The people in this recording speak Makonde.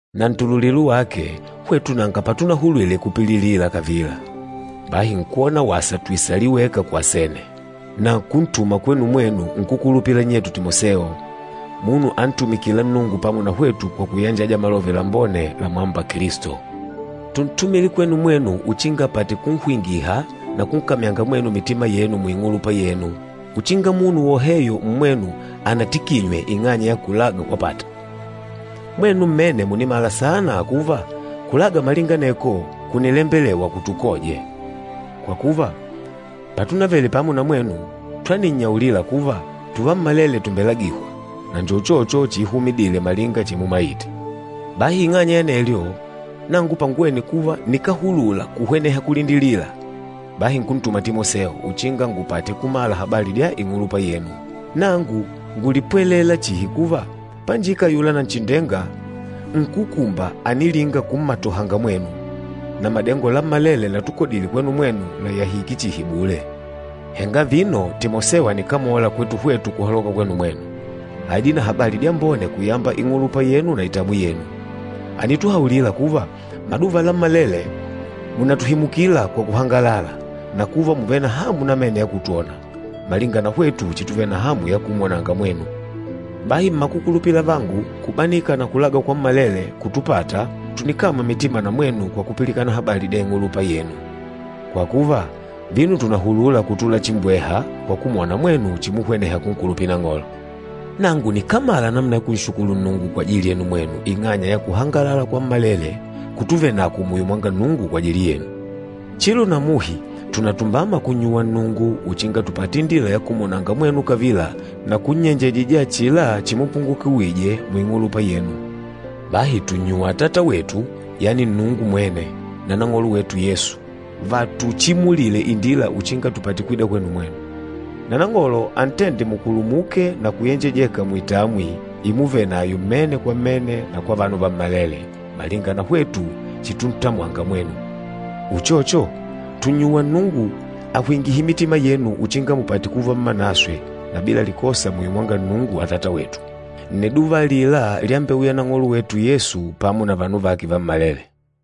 Na ntululilo wake, hwetu nanga patunahulwile kupililila kavila. Bahi nkwona wasa tuisalile weka ku Asene, na kuntuma kwenu mwenu nkúkulupila nnyetu Timoseo, munu antumikîla Nnungu pamo na hwetu kwa kuyanjaja Malove Lambone lamwâmba Kilisto. Túntumile kwenu mwenu uchinga apate kunhwingiha na kunkamyanga mwenu mitima yenu muing'ulupa yenu, uchinga munu woheyo mmwenu anatikinywe ing'anya ya kulaga kwapata. Mwenu mmene mùnimala saana kuva, kulaga malinga aneko kùnilembelewa kutukoje. Kwa kuva, patunavele pamo na mwenu, twaninnyaulila kuva, tuvammalele tumbelagihwa, na njo uchocho chiihumidile malinga chimumaite. Bahi ing'anya ya anelyo, nangu panguwene kuva nikáhulula kuhweneha kulindilila, bahi nkuntuma Timoseo uchinga ngupate kumala habali dya ing'ulupa yenu. Nangu ngúlipwelela chihi kuva, panjika ayula Nanchindenga, nkúkumba ànilinga kummatohanga mwenu, na madengo lammalele latukodile kwenu mwenu làyahike chihi bule. Henga vino Timoseo ànikamola kwetu hwetu kuhaloka kwenu mwenu. Àidile na habali dyambone kuyamba ing'ulupa yenu na itamwi yenu. Ànituhaulila kuva, maduva lammalele mùnatuhimukila kwa kuhangalala, na kuva mùvele na hamu namene ya kutwona, malinga na hwetu chituvele na hamu ya kumwonanga mwenu. Bahi mmakukulupila avangu, kubanika na kulaga kwammalele kútupàtà, tùnikamywa mitima na mwenu kwa kupilikana habali dya ing'ulupa yenu. Kwa kuva, vino tùnahulula kutula chimbweha kwa kumwona mwenu chimuhweneha kunkulupila Nang'olo. Nangu nikámala namuna ya kunshukulu Nnungu kwajili yenu mwenu ing'anya ya kuhangalala kwammalele kutuvenakwo muyo mwanga Nnungu kwajili yenu. Chilo na muhi tùnatumbama kunnyuwa Nnungu uchinga tupate indila ya kumwonanga mwenu kavila na kunnyenjejija achila chimupungukiwije muing'ulupa yenu. Bahi tùnnyuwa Atata wetu, yani Nnungu mwene, na Nang'olo wetu Yesu, vatuchimulile indila uchinga tupate kwida kwenu mwenu. Na Nang'olo antende mukulumuke na kuyenjejeka muitamwi imuvenayo mmene kwa mmene na kwa vanu vammalele, malinga na hwetu chituntamwanga mwenu. Uchocho, tùnnyuwa Nnungu ahwingihe mitima yenu uchinga mupate kuva mmanaswe na bila likosa muyo mwanga Nnungu Atata wetu, nniduva alila lyambeuya Nang'olo wetu Yesu, pamo na vanu vake vammalele.